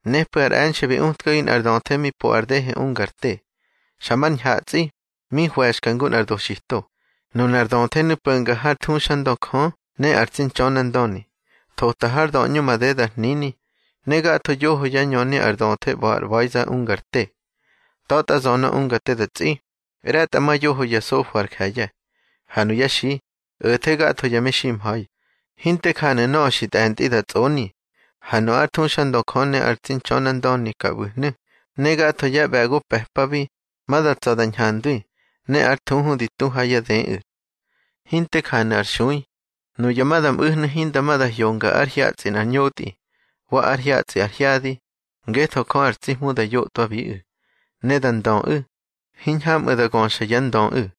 Nepꞌu̱ ar e̱nxe̱ bi utkagi nꞌar döthe mi po ar dehe unga ar te, xa mar ñhatsꞌi, mi hwe̱xka ngu nꞌar doxito. Nunar döthenu̱ po̱nga hár thuxandö Jö ne ar tsi Ntxönandöni. Thota har döꞌñu madeda ar hnini, ne gatho yoho yá ñöni ar döthe ꞌba̱ ar ꞌba̱iza ungar te. Ta̱tꞌa zönö unga te da tsꞌi, ꞌre̱tꞌamayoho ya sofo ar je̱ye̱, ha nuyá xi, o̱the gatho ya meximha̱i. Hinte janu̱ nöꞌö xi tꞌe̱ntꞌi da tsꞌoni. Ha nu ár thuxandö Jö ne ar tsi Ntxönandöni ka ꞌbu̱hnu̱, ne gatho yá ꞌbe̱go pe̱pabi, ma da tsa̱ da ñhandwi, ne ár thuhu di tu ha yá dëꞌu̱. Hinte janu̱ ar xui. Nuya ma da mꞌu̱hnu̱ hinda hyonga ár hyatsꞌi nꞌar ñotꞌi, wa ár hyatsꞌi ar hyadi, ngetho Jö ar tsi Hmu da yotꞌwabiꞌu̱. Ne da ndöꞌu̱, hiñhamꞌu̱ da göxa yá ndöꞌu̱.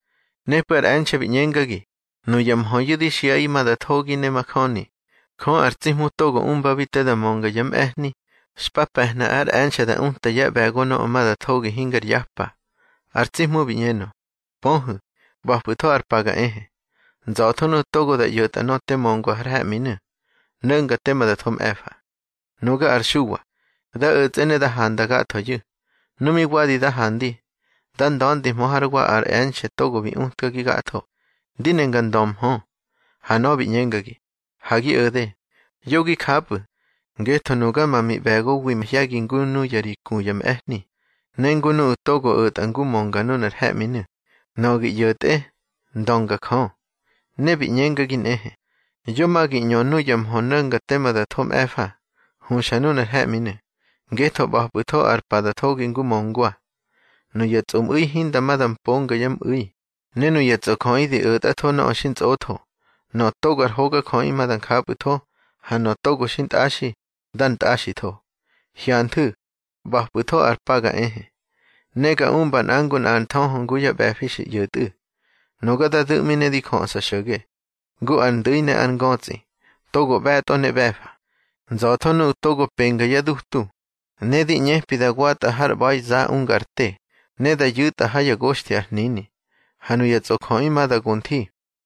Nepꞌu̱ ar e̱nxe̱ bi ꞌñengagi: —Nuya mhöyu̱ di xiꞌaꞌi ma da thogi ne majöni. Jö ar tsi Hmu togo umbabi te da mönga yá mꞌe̱hni, xpa pe̱hna ár e̱nxe̱ da uta yá ꞌbe̱go nöꞌö ma da thogi hingar yapa. Ar tsi Hmu bi ꞌñenö: —Pöhu̱, ꞌba̱pꞌu̱tho ar pa ga ehe. Nza̱tho nuꞌu̱ togo da ꞌyo̱tꞌa nöꞌö te möngwa har he̱ꞌminu̱, no̱nga tema da tho mꞌe̱fa. Nuga ar Xuwa, da o̱tsꞌe ne da handa gathoyu̱. Nu mi wadi da handi, da nda̱ndihmö hár wa ar e̱nxe̱ togo bi utkagi gatho, ndi ne nga ndömhö. Ha nöꞌö bi ꞌñengagi: —Ha gi o̱de. Yo gi japꞌu̱, ngetho nuga ma miꞌbe̱gowi mahye̱gi ngu nuya ri ku ya mꞌe̱hni, ne ngu nuꞌu̱ togo o̱tꞌa ngu mönga nunar he̱ꞌminu̱. Nöꞌö gi ꞌyo̱tꞌe, ndönga Jö. Ne bi ꞌñengagi nꞌehe: —Yo ma gi ꞌñö nuya mhö no̱nga tema da tho mꞌe̱fa, huxa nunar he̱ꞌminu̱, ngetho ꞌba̱pꞌu̱tho ar pa da thogi ngu möngwa. Nuya tsꞌomꞌu̱i hinda ma da mponga yá mꞌu̱i, ne nuya tsꞌojöꞌi di o̱tꞌatho nöꞌö xintsꞌotho. Nöꞌö togo ar hogajöꞌi ma da njapꞌu̱tho, ha nöꞌö togo xintꞌaxi, dar ntꞌaxitho. —Hyanthu̱, ꞌba̱pꞌu̱tho ar pa ga ehe, ne ga umba nꞌa ngu nꞌa ár nthöhö ngu yá ꞌbe̱fi xi ꞌyo̱tꞌu̱. Nuga da du̱ꞌmi ne di jöꞌsa xo̱ge, ngu ar ndu̱i ne ar ngötsꞌi, togo ꞌbe̱tꞌo ne ꞌbe̱fa. Nza̱tho nuꞌu̱ togo penga yá dutu, ne di ꞌñepi da watꞌa har ꞌba̱iza unga ar te, ne da yu̱tꞌa ha yá goxthi ar hnini. Ha nuya tsꞌojöꞌi ma da go nthi,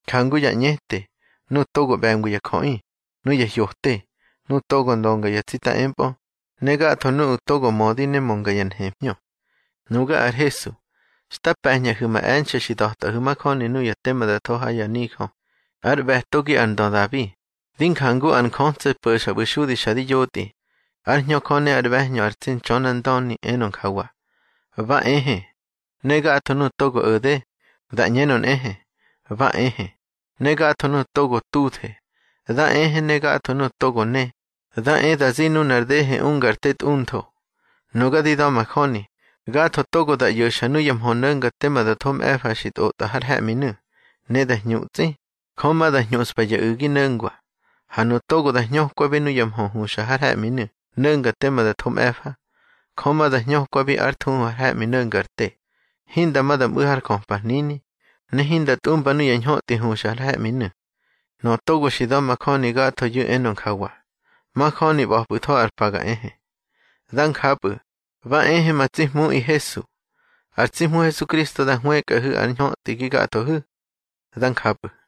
njangu ya ꞌñete, nuꞌu̱ togo ꞌbe̱ngwi ya jöꞌi, nuya hyote, nuꞌu̱ togo ndönga ya tsita empꞌö, ne gatho nuꞌu̱ togo mödi ne mönga ya nhemhñö. —Nuga ar Hesu, xta pe̱ñꞌahu̱ ma e̱nxe̱ xi da̱tꞌahu̱ majöni nuya tema da tho ha ya nijö. Ár ꞌbe̱togi ar ndö Dabi, di njangu ar njötso̱ po̱xa ꞌbu̱ xudi xa di yotꞌi. Ár Hñö Jö ne ár ꞌbe̱hñö ar tsi Ntxönandöni enö njawa: —Ba ehe. Ne gatho nuꞌu̱ togo o̱de, dá ꞌñenö nꞌehe: —Ba ehe. Ne gatho nuꞌu̱ togo tuthe, dá ehe, ne gatho nuꞌu̱ togo ne, dá e da zi nunar dehe unga ar te tꞌuntho. Nuga di da̱majöni, gatho togo da ꞌyo̱xa nuya mhö no̱nga tema da tho mꞌe̱fa xi tꞌotꞌa har he̱ꞌminu̱, ne da hñutsꞌi, Jö ma da hñuꞌspa ya u̱gi no̱ngwa. Ha nuꞌu̱ togo da hñökwabi nuya mhö huxa har he̱ꞌminu̱ no̱nga tema da tho mꞌe̱fa, Jö ma da hñökwabi ár thuhu har he̱ꞌmi no̱nga ar te, hinda ma da mꞌu̱ har jöpa hnini, ne hinda tꞌumba nuya ñhötꞌi huxa har he̱ꞌminu̱. Nöꞌö togo xi da̱majöni gathoyu̱ enö njawa: —Majöni ꞌba̱pꞌu̱tho ar pa ga ehe. Dá njapꞌu̱. Ba ehe ma tsi Hmuꞌi Hesu. Ar tsi Hmu Hesukristo da hwëkꞌahu̱ ár ñhötꞌi gi gathohu̱. Dá njapꞌu̱.